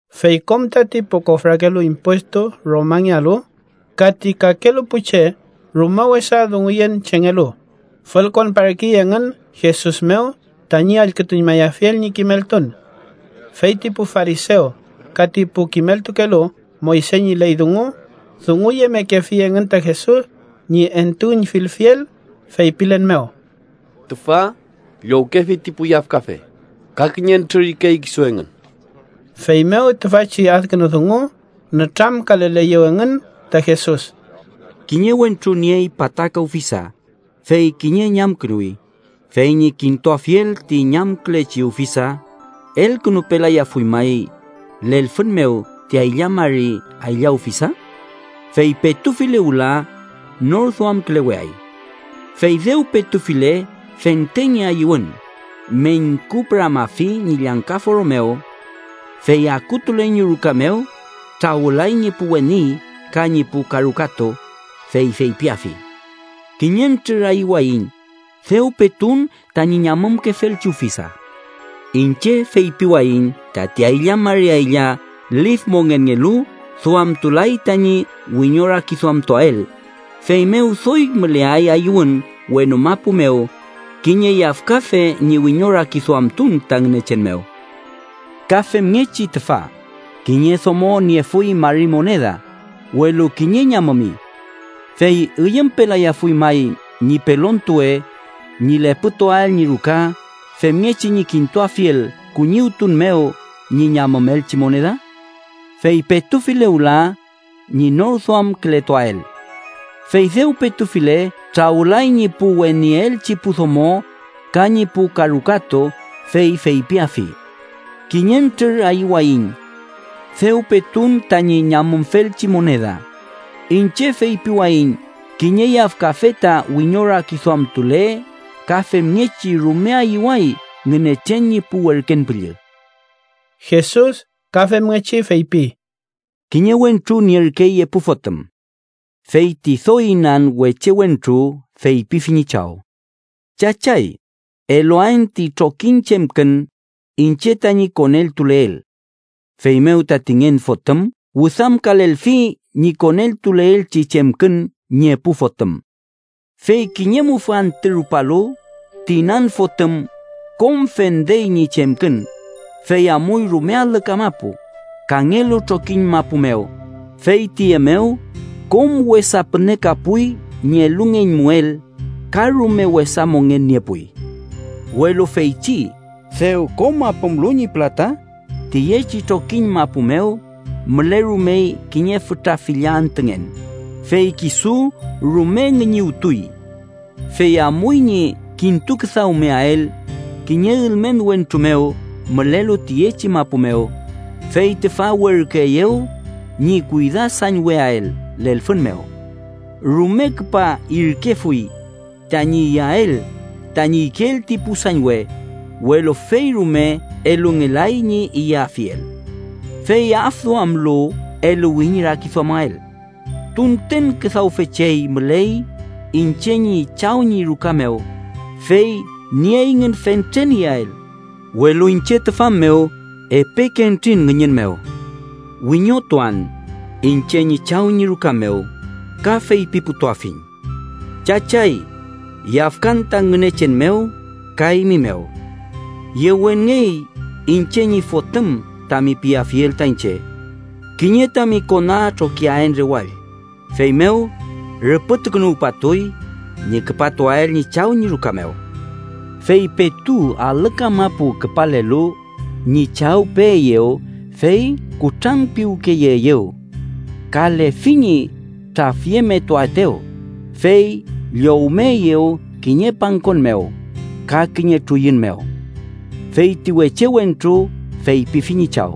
Fey kom tati pu kofrakelu impuestu Romangealu ka ti kakelu pu che rume wesa dunguyen chengelu, fülkonparkey engün Jesus mew tañi allkütuñmayafiel ñi kimeltun. Fey ti pu farisew ka ti pu kimeltukelu Moyse ñi ley dungu dunguyemekefi engün ta Jesus ñi entuüñfilfiel feypilen mew: —Tüfa llowkefi ti pu yafkafe ka kiñentrür ikey kisu engün. Feymew tüfachi adkünu dungu nütramkaleleyew engün ta Jesus: “Kiñe wentru niey pataka ufisa, fey kiñe ñamkünuwi. Fey ñi kintuafiel ti ñamkülechi ufisa, ¿elkünupelayafuy may lelfün mew ti aylla mari aylla ufisa? Fey petufile wüla, nor duamküleweay. Fey dew petufile, fente ñi ayüwün meñkupüramafi ñi llangka foro mew. Fey akutule ñi ruka mew, trawülay ñi pu weni ka ñi pu karukatu, fey feypiafi: ‘Kiñentrür ayüwayiñ, dew petun tañi ñamümkefelchi ufisa.’ Iñche feypiwayiñ tati aylla mari aylla lif mongenngelu duamtulay tañi wiñorakiduamtuael, feymew doy müleay ayüwün wenu mapu mew kiñe yafkafe ñi wiñorakiduamtun ta Ngünechen mew. “Ka femngechi tüfa: Kiñe domo niefuy mari moneda, welu kiñe ñamümi. ¿Fey üyümpelayafuy may ñi pelontuwe ñi lepütuael ñi ruka femngechi ñi kintuafiel kuñiwtun mew ñi ñamümelchi moneda? Fey petufile wüla, ñi norduamkületuael. Fey dew petufile trawülay ñi pu weniyeelchi pu domo, ka ñi pu karukatu, fey feypiafi: ‘Kiñentrür ayüwayiñ. Dew petun tañi ñamümfelchi moneda.’ Iñche feypiwayiñ kiñe yafkafe ta wiñorakiduamtule ka femngechi rume ayüway Ngünechen ñi pu werken püllü.” Jesus ka femngechi feypi: “Kiñe wentru nierkey epu fotüm. Fey ti doy inan weche wentru feypifi ñi chaw: ‘Chachay, eluaen ti trokiñ chemkün iñche tañi koneltuleel.’ Feymew tati ngen fotüm wüdamkalelfi ñi koneltuleelchi chemkün ñi epu fotüm. Fey kiñe mufü antü rupalu, ti inan fotüm kom fendey ñi chemkün, fey amuy rume alü kamapu, kangelu trokiñ mapu mew, fey tüye mew kom wesa pünekapuy ñi elungeñmuel ka rume wesa mongen niepuy. “Welu feychi dew kom apümlu ñi pülata, tüyechi trokiñ mapu mew mülerumey kiñe fütra filla antüngen, fey kisu rume ngüñüwtuy. Fey amuy ñi kintuküdawmeael kiñe ülmen wentru mew mülelu tüyechi mapu mew, fey tüfa werküeyew ñi kuydasañweael lelfün mew. Rume küpa irkefuy tañi iyael tañi ikeel ti pu sañwe, welu fey rume elungelay ñi iyafiel. Fey afduamlu eluwi ñi rakiduamael: ‘¡Tunten küdawfe chey müley iñche ñi chaw ñi ruka mew, fey nieyngün fentren iyael, welu iñche tüfa mew epeke entrin ngüñün mew!’ Wiñotuan iñche ñi chaw ñi ruka mew, ka feypiputuafiñ: ‘Chachay, yafkan ta Ngünechen mew ka eymi mew. Yewenngey iñche ñi fotüm tami piafiel ta iñche. Kiñe tami kona trokiaen rewall.’ Feymew rüpütukünuwpatuy ñi küpatuael ñi chaw ñi ruka mew. “Fey petu alü kamapu küpalelu, ñi chaw peeyew fey kutranpiwkeyeeyew. Ka lefi ñi trafyemetuaetew, fey llowmeeyew kiñe pangkon mew ka kiñe truyun mew. Fey ti weche wentru feypifi ñi chaw: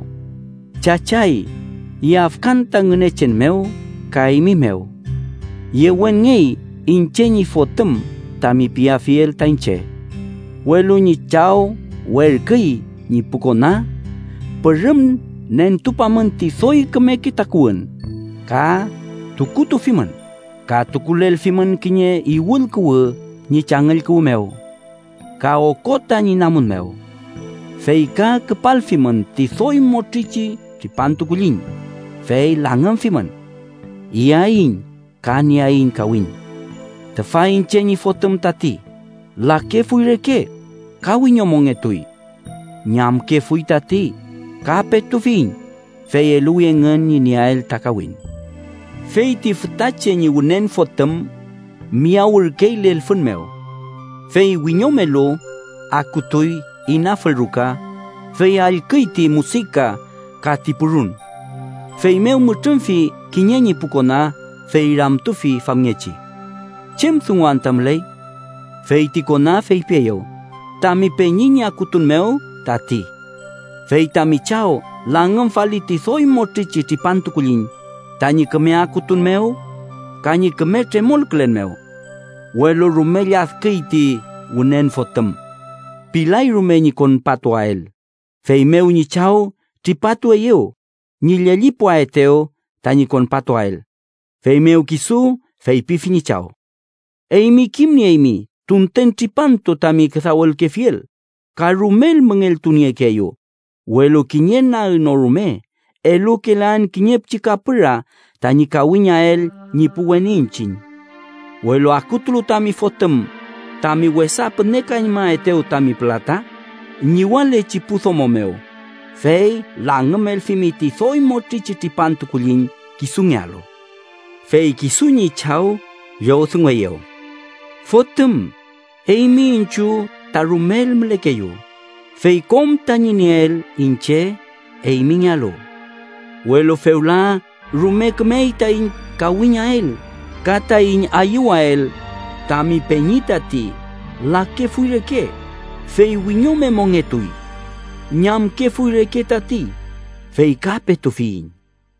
‘Chachay, yafkan ta Ngünechen mew ka eymi mew. Yewenngey iñche ñi fotüm tami piafiel ta iñche.’ Welu ñi chaw werküy ñi pu kona: ‘Pürüm nentupamün ti doy kümeke takuwün ka tukutufimün. Ka tukulelfimün kiñe iwül kuwü ñi changüll kuwü mew ka okota ñi namun mew. Fey ka küpalfimün ti doy motrichi tripantu kulliñ, fey langümfimün. ¡Iyaiñ ka nieaiñ kawiñ. Tüfa iñche ñi fotüm tati, lakefuy reke ka wiñomongetuy. Ñamkefuy tati, ka petufiyiñ!’ Fey eluwi engün ñi nieael ta kawiñ. “Fey ti fütache ñi wünen fotüm miyawürkey lelfün mew. Fey wiñomelu, akutuy inafül ruka, fey allküy ti musika ka ti purun. Feymew mütrümfi kiñe ñi pu kona, fey ramtufi famngechi: ‘¿Chem dungu anta müley?’ Fey ti kona feypieyew: ‘Tami peñi ñi akutun mew tati. Fey tami chaw langümfali ti doy motrichi tripantu kulliñ, tañi küme akutun mew ka ñi küme tremolkülen mew.’ Welu rume lladküy ti wünen fotüm. Pilay rume ñi konpatuael, feymew ñi chaw tripatueyew ñi llellipuaetew tañi konpatuael. Feymew kisu feypifi ñi chaw: ‘Eymi kimnieymi tunten tripantu tami küdawelkefiel, ka rumel müngeltuniekeeyu, welu kiñe nag no rume elukelaen kiñe pichi kapüra tañi kawiñael ñi pu weni iñchiñ. Welu akutulu tami fotüm, tami wesa pünekañmaetew tami pülata ñiwalechi pu domo mew, fey langümelfimi ti doy motrichi tripantu kulliñ kisungealu.’ “Fey kisu ñi chaw llowdungueyew: ‘Fotüm, eymi iñchiw ta rumel mülekeyu, fey kom tañi nieel iñche eymingealu. Welu fewla rume kümey taiñ kawiñael ka taiñ ayüwael tami peñi tati lakefuy reke, fey wiñome mongetuy. Ñamkefuy reke tati, fey ka petufiyiñ.’”